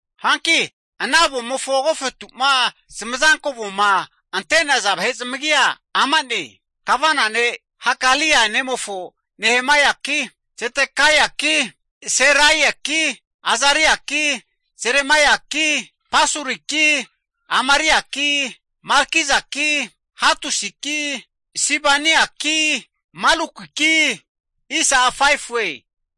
Hanki ana avomofo agofetu'ma zamazanko avoma ante'naza vahe zamagia ama'ne. Kavana ne' Hakalia nemofo Nehemaiaki, Zedekaiaki, Seraiaki, Azariaki, Jeremaiaki, Pasuriki, Amariaki, Malkijaki, Hatusiki, Sibaniaki, Malukiki,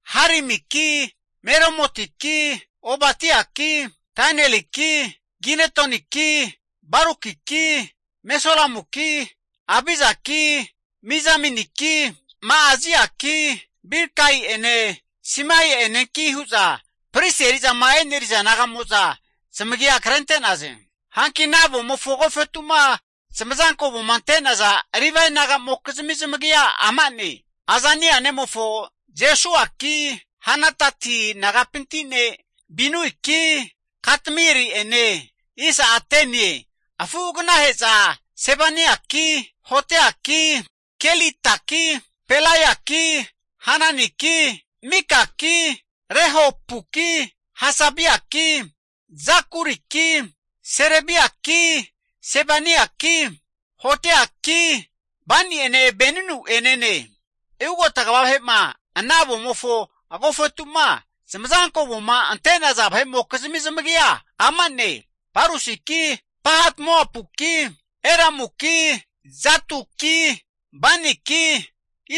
Harimiki Meremotiki Obadiaki, Danieliki Ginetoniki Barukiki, Mesulamuki Abijaki Mijaminiki, Ma'aziaki Bilgai'ene Simaia'enenki hu'za pristi eri'zama eneriza naga'mo'za zamagia krente'naze. Hanki ana avomofo agofetu'ma zamazanko avoma ante'naza Livae nagamokizmi zamagia ama'ne, Azania nemofo Jesuaki, Henadati nagapinti ne' Binuiki, Katmieli'ene, afuagnahe'za Sebaniaki, Hodiaki, Kelitaki, Pelaiaki, Hananiki, Mikaki, Rehopuki, Hasabiaki, Zakuriki Serebiaki Sebaniaki, Hodiaki, Bani'ene Beninu'enene. Hanki ugota kva vahe'ma ana avomofo agofetu'ma zamazanko avoma ante'naza vahe'mokizmi zamagia ama'ne, Parosiki Pahat-Moapuki, Elamuki, Zattuki, Baniki,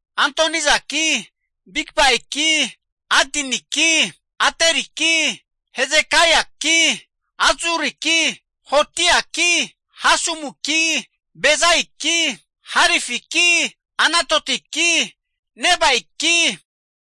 Adonijaki, Bigvaiki, Adiniki, Ateriki, Hezekaiaki, Azzuriki, Hodiaki Hasumiki, Bezaiki, Harifiki, Anatotiki, Nebaiki,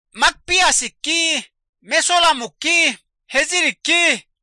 Makpiasiki, Mesulamuki, Heziriki,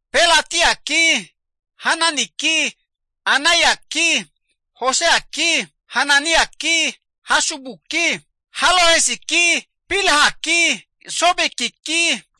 Pelatiaki, Hananiki, Anaiaki, Hoseaki, Hananiaki, Hasubuki, Halohesiki, Pilhaki, Sobekiki,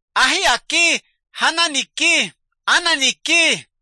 Ahiaki, Hananiki, Ananiki,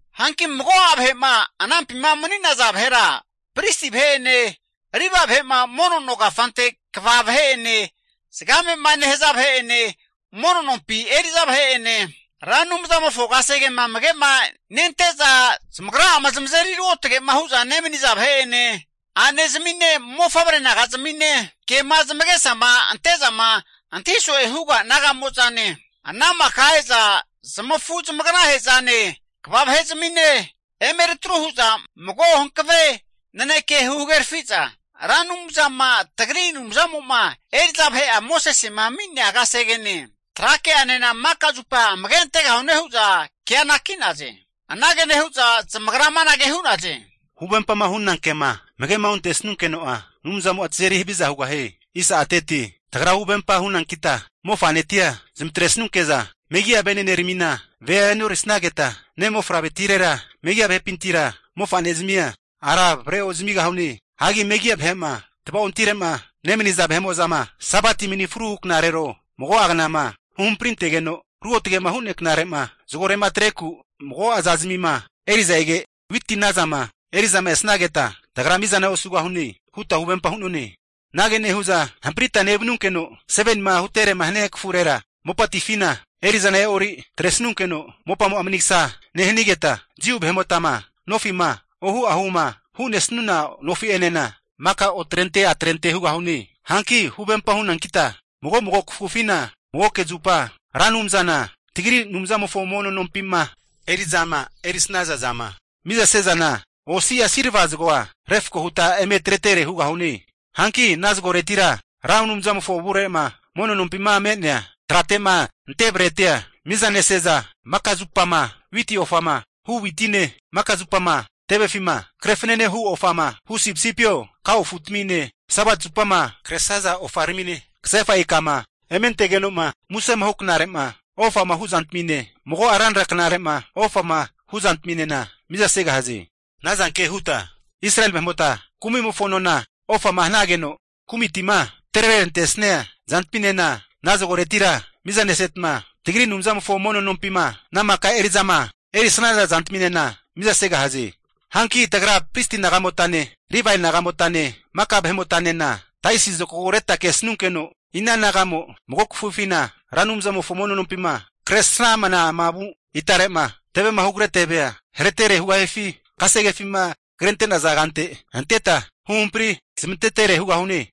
Hanki mago'a vahe'ma anampima mani'naza vahera pristi vahe'ene Livae vahe'ma mono no kafante kva vahe'ene zagame'ma nehaza vahe'ene, mono nompi eri'za vahe'ene, Ra Anumzamofo kasegema amage'na nente'za zamagra'ama zamazeri ruotge'ma hu'zama nemaniza vahe'ene a'nezamine mofavre naga'zamine kema zamagesama ante'zama antahi so'e huga naga'mozane, ana maka vahe'mo'za e'za zamafu zamaganahe'zane kva vahe'zamine eme eri atru hu'za mago hankave naneke huhagerafi'za, Ra Anumzama tagri Anumzamo'ma eri'za vahe'a Mosesema ami'nea kasegene, trake'anena maka zupa amage antegahune hu'za kea anaki'naze. Anage nehu'za zamagra amanage hu'naze, Huvempama huna ke'ma amage'ma ontesanunkeno'a Anumzamo'a tazeri haviza hugahie. Tagra huvempa hunankita mofa'netia zamatresunke'za megi'a veneneramina vea enorisageta, ne' mofavretirera megi'a vahepintira mofa'ne zamia ara avare ozamigahune. Hagi megi'a vahe'ma tva'ontire'ma nemaniza vahe'mo'zama Sabati manifru hu knarero, mago'a knama huhampri antegeno ruotgema hu'nea knare'ma zagore'ma atreku mago'a zazmima eri'za ege, witi nazama eri'zama esnageta tagra mizana osegahune huta huvempa hu'none. Anage nehu'za hampritama nevanunkeno 7nima hutere hania kafurera, mopatifina eri'zana e'ori atresanunkeno mopamo'a manigsa nehanigeta, Jiu vahe'motama nofi'ma ohu ahuma hu'nesuna nofi'enena maka otrente atrente hugahune. Hanki huvempa hunankita mago mago kafufina magoke zupa, Ra Anumzana tagri Anumzamofo mono nompima eri'zama erisnaza zama mizase zana, osi'a silva zagoa refko huta eme atretere hugahune. Hanki ana zagoretira, Ra Anumzamofo avure'ma mono nompima me'nea trate'ma ante bretia miza nese'za, maka zupama witi ofama hu' witine, maka zupama tevefima kre fanane hu ofama hu sipisipio kao afutamine, Sabati zupama kresaza ofaramine, kasefa ikama ementegeno'ma musema hu knare'ma ofama hu zantamine, mago'a ranra knare'ma ofama huzantaminena miza segahaze. Ana zanke huta Israeli vahe'mota kumi'mofo nona, ofama hanageno kumitima atrerantesia zantaminena ana zagoretira miza nesetma, tagri Anumzamofo mono nompima ana maka eri'zama erisaza zantaminena mizasegahaze. Hanki tagra pristi naga'motane, Livae naga'motane, maka vahe'motanena taisi zokago reta kesanunkeno, ina naga'mo mago kafufina Ra Anumzantimofo mono nompima kresramnama vu itare'ma tevema hugare tevea haretere hugahifi, kasegefima krente'naza kante anteta huhampari zamantetere hugahune.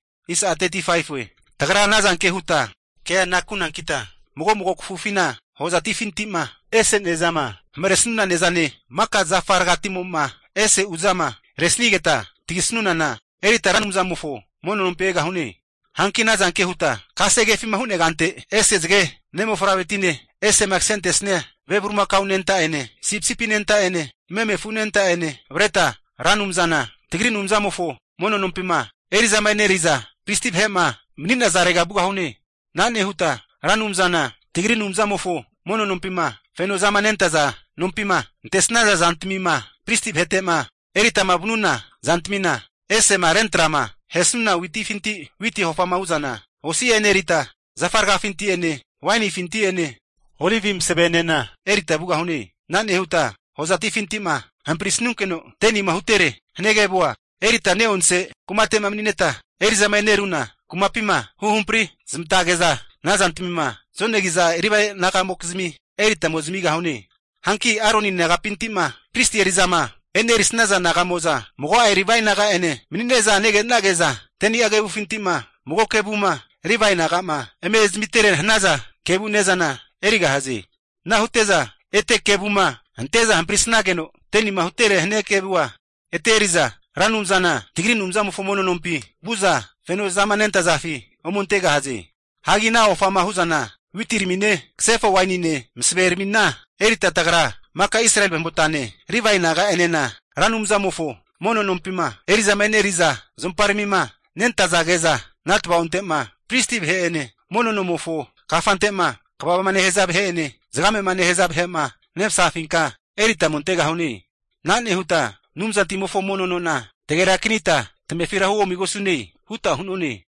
Tagra anazanke huta kea anakunankita mago mago kafufina hozatifinti'ma ese ne'zama hamaresuna ne'zane, maka zafa rgatimo'ma ese uza'ma resanigeta tagisunana erita Ra Anumzamofo mono nompi egahune. Hanki ana zanke huta kasegefi hu'nea kante anteta ese zage ne' mofavretine, esema kasentesia ve bulimakao anenta'ene sipisipi anenta'ene meme afu anenta'ene avreta Ra Anumzana tagri Anumzamofo mono nompima eri'zama eneri'za pristi vahe'ma mani'nazare vugahune. Ana nehuta Ra Anumzana tagri Anumzamofo mono nompima fenozama nentaza nompima antesnaza zantamima pristi vahete'ma eritama vanuna zantamina, ese'ma rentrama ahesuna witifinti, witi ofama hu'zana osi'a enerita, zafa ragafinti'ene wainifinti'ene olivi masavenena erita vugahune. Ana nehuta hozatifinti'ma hamparisanunkeno 10nima hutere hania kevua erita ne'onse kumate'ma mani'neta eri'zama eneruna kumapima huhampri zamantage'za ana zantamima zonegi'za Livae naga'mokizmi erita ome zamigahune. Hanki Aroni nagapinti'ma pristi eri'zama e'nerisnaza naga'mo'za mago'a Livae naga'ene mani'ne'za nege'nage'za, 10ni'a kevufinti'ma mago kevuma Livae naga'ma eme zamitere hanaza kevu ne'zana erigahaze. Ana hute'za ete kevuma ante'za hamparisnageno 10nima hutere hania kevua ete eri'za Ra Anumzana tagri Anumzamofo mono nompi vu'za fenozama nentazafi ome antegahaze. Hagi ana ofama hu'zana witiramine kasefa wainine olivi masaveramina erita tagra maka Israeli vahe'motane, Livae naga'enena, Ra Anumzamofo mono nompima eri'zama e'neri'za zuomparamima nentazage'za, ana tava'onte'ma pristi vahe'ene mono nomofo kafante'ma kvama nehaza vahe'ene, zagamema nehaza vahe'ma nemasafinka erita ome antegahune. Ana nehuta Anumzantimofo mono nona tagerakanita tamefira huomigosune huta hu'none.